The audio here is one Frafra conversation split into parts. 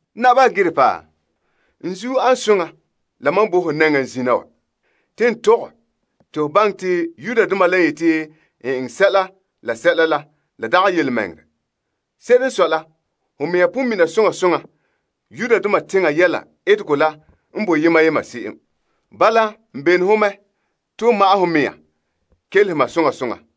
Naba Agripa, n zuo an soŋa la mam bo ho nɛŋa zina wa. Te n tɔgɛ te ho baŋɛ te Yudoma la n yete n eŋɛ sɛla la sɛla la la dagɛ yelemɛŋɛrɛ. Se'ere n sɔe la, ho mea pon mina soŋa soŋa Yudoma teŋa yɛla etegɔ la n bo yema yema se'em. Bala n bene ho mɛ te ho ma'ɛn ho mea kelehe ma soŋa soŋa.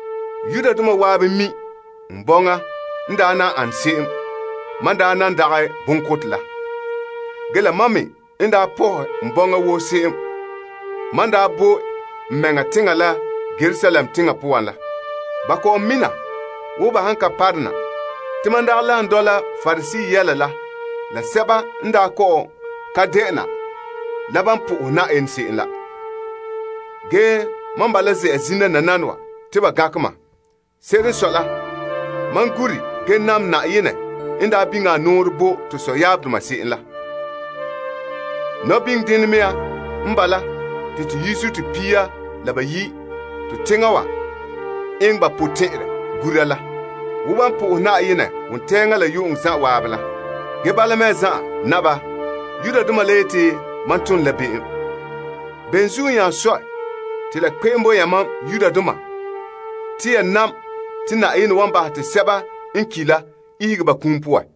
Yudoma zan'an mi' n bɔŋa n daa ane se'em mam n daa nan dagɛ bonkotɛ la. Ge la mam me n daa pɔhɛ n bɔŋa woo se'em mam n daa bo n mɛŋa teŋa la Yerusalem teŋa poan la. Ba kɔ'ɔn mina zo'e zo'e wo ba han ka parona te mam daa lagom dɔla Pariseedoma yɛla la sɛba n daa kɔ'ɔn ka de'ena la ban po'ohe Yenɛ se'em la. Ge mam bala ze'a zina nananawa te ba gankɛ mam. Se'ere n sɔe la, mam gure ge nam Yenɛ n daa biŋe a nɔɔrɛ bo to sɔyaabdoma se'em la. Nɔbiŋdenɛ nɔɔ n bala te to yizuto pia la bayi' to teŋa wa eŋɛ ba potɛn'ɛrɛ gura la, wo ban po'ohe Yenɛ wontɛŋa la yu'uŋɔ zan'an la. Ge bala mea zan'an, Naba, la dela tɛn'dena wa la zuo te Yudoma la yeti te mam tom la be'em. Bene zuo nya sɔe te la kpe'em bo yamam Yudoma te ya sakɛ te Yenɛ wan bahɛ te sɛba n ki' la ihege ba kum poan?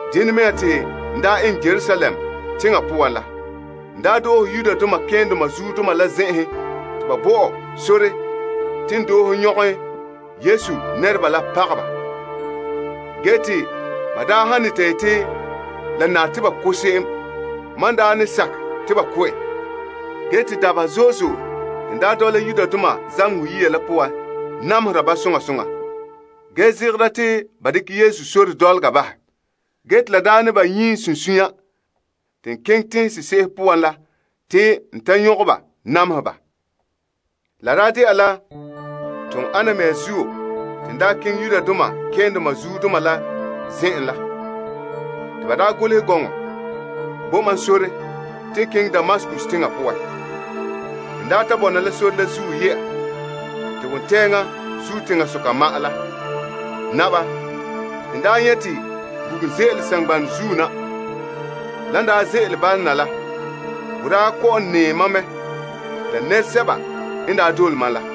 Dena mea te n daa eŋɛ Yerusalem teŋa poan la. N daa doohe malema keendoma la zen'enhen te ba bo ɔ sore te n doohe nyɔkɛ Yesu nɛreba la pagɛ ba. Ge te ban daa ne yete la nare ba ko' se'em, mam daa ne sakɛ te ba ko' en. Dabeha zo'e zo'e te n daa dɔla zamehegɔ yiya la poan namehera ba zo'e zo'e, ge zegera te ba dekɛ Yesu sore dɔlɔga bahɛ. Ge te n daa nyie n sunsunya zo'e zo'e keŋɛ tenhen sese'ehe poan la te n ta nyɔkɛ ba namehe ba. Te la daa de'a la toon ana mea zuo te n daa keŋɛ Yudoma malemadoma la zen'en la te ba daa golehɛ gɔnɔ bo ma sore te n keŋɛ Damaskus teŋa poan. N daa ta bɔna la sore zuo ye'a te wontɛŋa zuo teŋasoka ma'an la, Naba, te n daa nyɛ' te bugum ze'ele saŋgbanɛ zuo na. Lan daa ze'ele bala na la, bo daa kɔ'ɔn nɛɛ ma mɛ la nɛresɛba n daa dole mam la.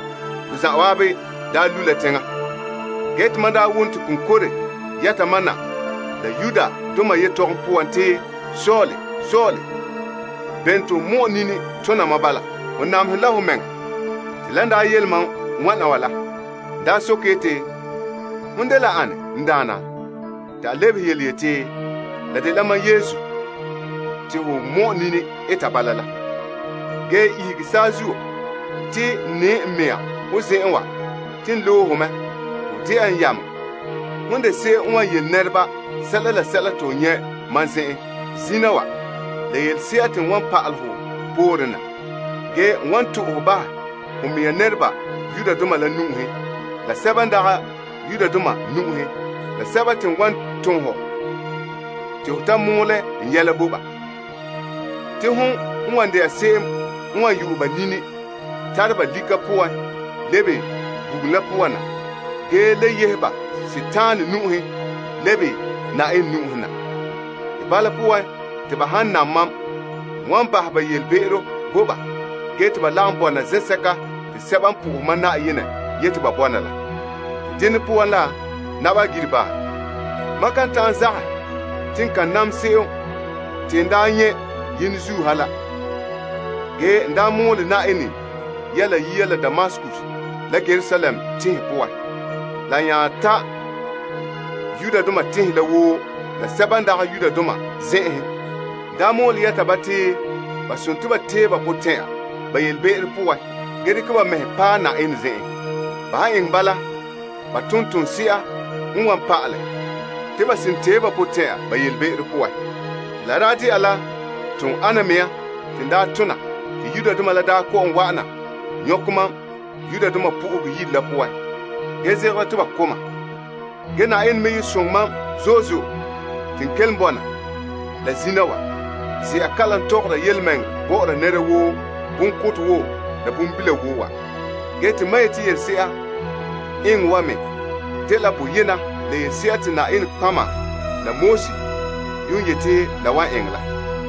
Ton zan'an daa lu' la teŋa, te mam daa wom te konkore yɛta ma na la Aramaik yetɔgom poan te, Saul, Saul, bene te ho mɔ'ɛn nini tona ma bala? Ho namehere la ho mɛŋa. Te n daa soke yeti, Hon dela ane, n Daana? Te a lebehe yeti, La dela mam Yesu te ho mɔ'ɛn nini eta bala la. Ge ihege saazuo te n nɛɛ n mea ho zen'en wa te n loe ho mɛ te ho de'a n yameŋa yele nɛreba sɛla la sɛla te ho nyɛ' mam zen'en zina wa la yelese'a te n wan pa'ala hɔ pooren na. N wan fan' ho bahɛ ho mea nɛreba Yudoma la nu'uhen la sɛba n dagɛ Yudoma sɛba te n wan ton ho te ho mɔɔlɛ n yɛla bo ba nu'uhen. Hon wan yu'ɛ ba nini tara ba lika poan lebe bugum la poan ge yehe ba Dima nu'uhen lebe Yenɛ nu'uhen na. Bala poan te ba han nam mam, n wan bahɛ ba be'em bo ba ge te ba lagom sɛba n na'aha mam Yenɛ yete ba bɔna la. Dene poan la, Naba Agripa, mam kan ta'an zagahɛ te n kan nam se'em te n daa nyɛ' yenzuo ha la. Ge n daa mɔɔlɛ Yenɛ yɛla yia la Damaskus la Yerusalem tenhen poan a nya ta' Yudea tenhen la woo la sɛba n dagɛ Yudoma zen'enhen. N daa mɔɔlɛ yɛta ba te ba tee ba potɛn'ya ba be'em poan ge dekɛ ba mɛhe paɛ Yenɛ zen'en la ton toonse'a n wan pa'alɛ te ba seren tee ba potɛn'ya. Te la daa de'a la toon ana mea te n daa tona te Yudoma la daa kɔ'ɔn wa'ana nyɔkɛ mam Yenɛ Yire la poan, ge zegera te ba ko' ma mea. Yenɛ me ye soŋɛ mam zo'e zo'e te n kelom bɔna ge la zina wa ze'a kalam tɔgɔra yelemɛŋɛrɛ bɔ'ɔra nɛra woo bonkotɛ wo la bonbila wo wa. Ge te mam yete yelese'a eŋɛ wa me dela boyena la yelese'a te nɔtɔgɔheba la Moses yuun yete la wan eŋɛ la.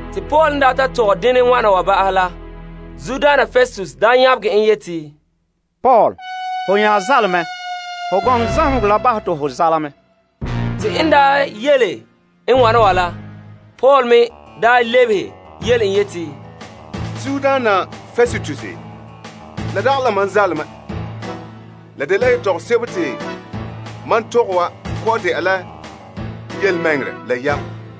Te Paul n ta tɔgɛ denɛ wana ba'ahɛ la, Festus nyabegɛ en yeti, Paul, ho nya zaale mɛ! Ho gɔŋɔ zamehegɔ la bahɛ te ho zaale mɛ! Ge Paul me lebehe yele en yeti, Zuodaana Festus, la dagɛ la ma zaale mɛ. La dela yetɔgom sebo te ma tɔgɛ wa kɔ'ɔn de'a la yelemɛŋɛrɛ la yam.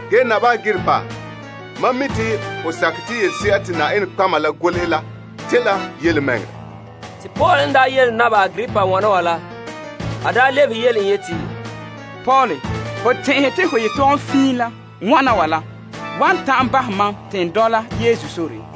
Ge, Naba Agripa, mam mi' te ho sakɛ te yelese'a te nɔtɔgɔheba la golehɛ la dela yelemɛŋɛrɛ. Agripa lebehe en yeti, Paul, ho tɛn'ɛhɛ te ho yetɔgom fiin la wana wa la wan ta'an bahɛ mam te n dɔla Yesu sore?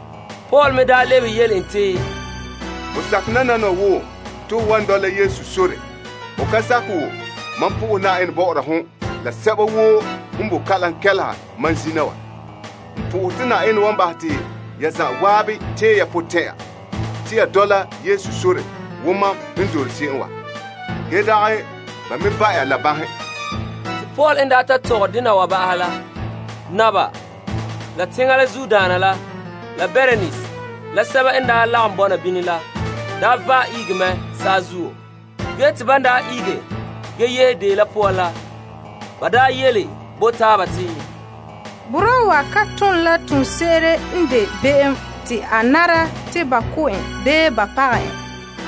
Paul me daa lebehe en te, Ho sakɛ nananawa wo te ho wan dɔla Yesu sore, ho ka sakɛ wo, mam po'ohe Yenɛ bɔ'ɔra hon la sɛba woo n bo kalam kɛleha mam zina wa te Yenɛ wan bahɛ te ya zan'an tee ya potɛn'ya te ya dɔla Yesu sore wo mam n dole se'em wa, ge dagɛ ba me ba' ya la banhe. Te Paul n ta tɔgɛ dena wa ba'ahɛ la, naba la teŋbehera la Bernise la sɛba n lagom bɔna bini la vaɛ ihege mɛ saazuo. Ge te ban yehe deo la poan la, ba yele bo taaba te, Boraa wa ka ton la toonse'ere n de be'em te la nare te ba ko' en bii ba pagɛ en.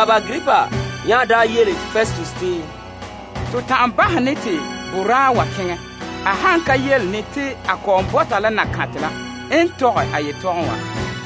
Agripa nya yele Festus te, To ta'an bahɛ ne te boraa wa keŋɛ a han ka yele ne te a kɔ'ɔn bɔta la Kaesar la n tɔgɛ a yetɔgom wa.